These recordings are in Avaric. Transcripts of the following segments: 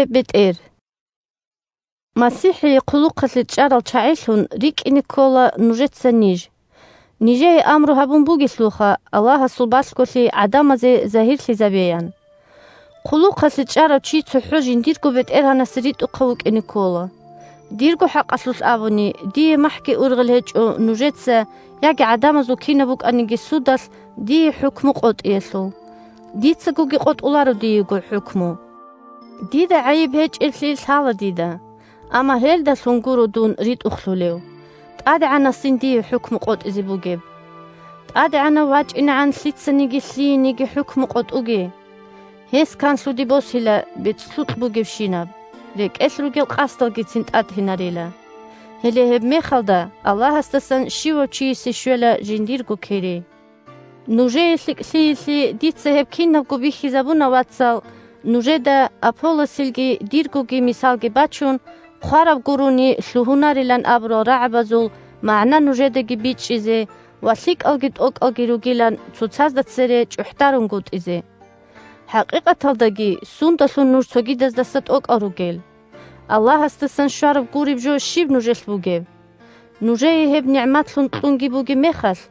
бетӀер МасихӀил чапарзаби 1МасихӀие хъулухъалъе чӀарал чагӀилъун рикӀкӀине ккола нужеца ниж. Нижее амру гьабун бугелъулха Аллагьасул балъголъи гӀадамазе загьирлъизабеян. 2Хъулухъалъе чӀарав чи цохӀо жиндирго бетӀергьанасе ритӀухъав вукӀине ккола. 3Дирго хӀакъалъулъ абуни, дие махӀги ургъел гьечӀо нужеца яги гӀадамазул кинаб букӀаниги судалъ дие хӀукму къотӀиялъул. Дицагоги къотӀуларо диего хӀукму. 4Дида гӀайиб гьечӀеблъи лъала дида. Амма гьелдалъун гуро дун ритӀухълъулев. ТӀадегӀанасин дие хӀукму къотӀизе бугеб. ТӀадегӀанав вачӀинегӀан лъицаниги лъиениги хӀукму къотӀуге. Гьес канлъуде босила бецӀлъукь бугебщинаб, рекӀелъ ругел къасдалгицин тӀатинарила. Гьеле гьебмехалда Аллагьасдасан щивав чиясе щвела жиндирго кири. Нужее лъикӀлъиялъе дица гьеб кинабго бихьизабуна, вацал, нужеда, Аполлосилги диргоги мисалги бачун, «хъвараб гурони лъугьунарилан» абурал рагӀабазул магӀна нужедаги бичӀчӀизе ва, лъикӀалги тӀокӀалги ругилан, цоцазда цере чӀухӀдарунгутӀизе. ХӀакъикъаталдаги сундалъун нуж цогидаздаса тӀокӀал ругел? Аллагьасдасан щвараб гуреб жо щиб нужелъ бугеб? Нужее гьеб нигӀматлъун кьунги бугеб мехалъ,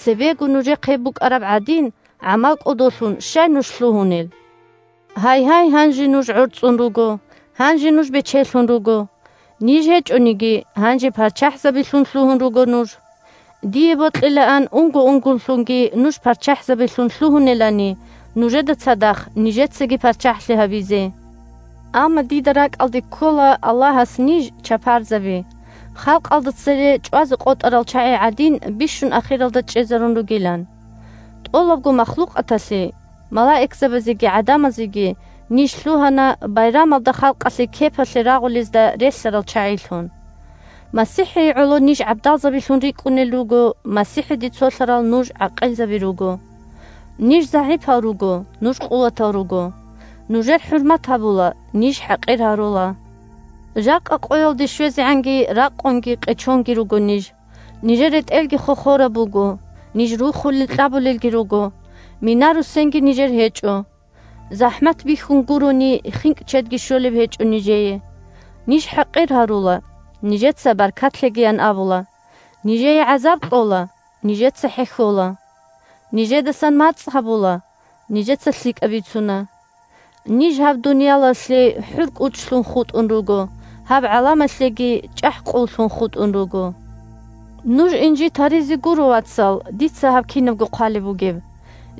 цебего нужехъ гьеб букӀараб гӀадин, гӀамал кӀодолъун щай нуж лъугьунел? Гьайгьай, гьанже нуж гӀорцӀун руго! Гьанже нуж бечелъун руго! Ниж гьечӀониги, гьанже парччахӀзабилъун лъугьун руго нуж. Дие бокьилаан унго-унголъунги нуж парччахӀзабилъун лъугьунелани, нужеда цадахъ нижецаги парччахӀлъи гьабизе. Амма дида ракӀалде ккола Аллагьас ниж – чапарзаби, халкъалда цере чӀвазе къотӀарал чагӀи гӀадин, бищун ахиралда чӀезарун ругилан. ТӀолабго махлукъаталъе – малаикзабазеги гӀадамазеги ниж лъугьана байрамалда халкъалъе кепалъе рагъулезда релълъарал чагӀилъун. МасихӀие гӀоло ниж гӀабдалзабилъун рикӀкӀунел руго, МасихӀиде цолъарал нуж гӀакъилзаби руго. Ниж загӀипал руго, нуж къуватал руго. Нужер хӀурмат гьабула, ниж хӀакъир гьарула. Жакъа къоялде щвезегӀанги ракъунги къечонги руго ниж. Нижер ретӀелги хохораб буго, ниж рухулел-кьабулелги руго, мина-руссенги нижер гьечӀо. ЗахӀмат бихьун гурони хинкӀ-чедги щолеб гьечӀо нижее. Ниж хӀакъир гьарула – нижеца баркат лъегиян абула, нижее гӀазаб кьола – нижеца хӀехьола. Нижедасан мацӀ гьабула – нижеца лъикӀаб бицуна. Ниж гьаб дуниялалъе хӀур-кӀучлъун хутӀун руго, гьаб гӀаламалъеги чӀахӀ-къуллъун хутӀун руго. Нуж инжит гьаризе гуро, вацал, дица гьаб кинабго хъвалеб бугеб.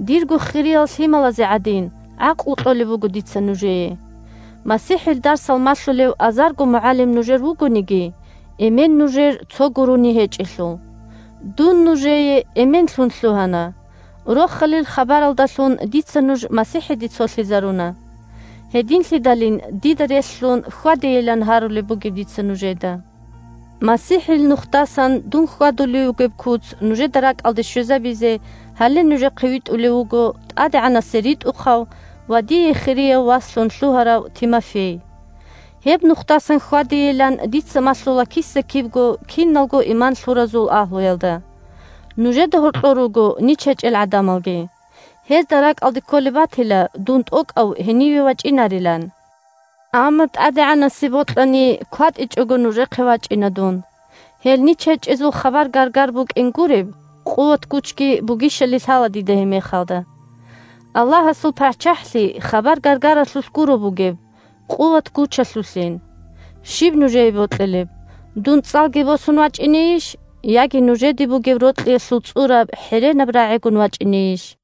Дирго хириял лъималазе гӀадин, гӀакълу кьолеб буго дица нужее. МасихӀил дарсал малъулев азарго мугӀалим нужер вугониги, эмен нужер цо гурони гьечӀелъул. Дун нужее эменлъун лъугьана, Рохалил хабаралдалъун дица нуж МасихӀиде цолъизаруна. Гьединлъидалин дида релълъун хьвадейилан гьарулеб бугеб дица нужеда. МасихӀил нухдасан дун хьвадулев вугеб куц нужеда ракӀалде щвезабизе гьале нужехъе витӀулев вуго ТӀадегӀанасе ритӀухъав ва дие хирияв васлъун лъугьарав Тимофей. Гьеб нухдасан хьвадейилан дица малъула киса-кибго киналго иман лъуразул агьлуялда. Нужеда гьоркьор руго нич гьечӀел гӀадамалги. Гьезда ракӀалде кколеб батила дун тӀокӀав гьениве вачӀинарилан. Амма, ТӀадегӀанасе бокьани, кватӀичӀого нужехъе вачӀина дун. Гьел нич гьечӀезул хабар-гаргар букӀин гуреб, къуват-гучги бугищали лъала дида гьебмехалда. Аллагьасул ПарччахӀлъи хабар-гаргаралъулъ гуро бугеб, къуват-гучалъулъин. Щиб нужее бокьилеб? Дун цӀалги босун вачӀинейищ, яги нужеде бугеб рокьиялъул цӀураб хӀеренаб рагӀигун вачӀинейищ?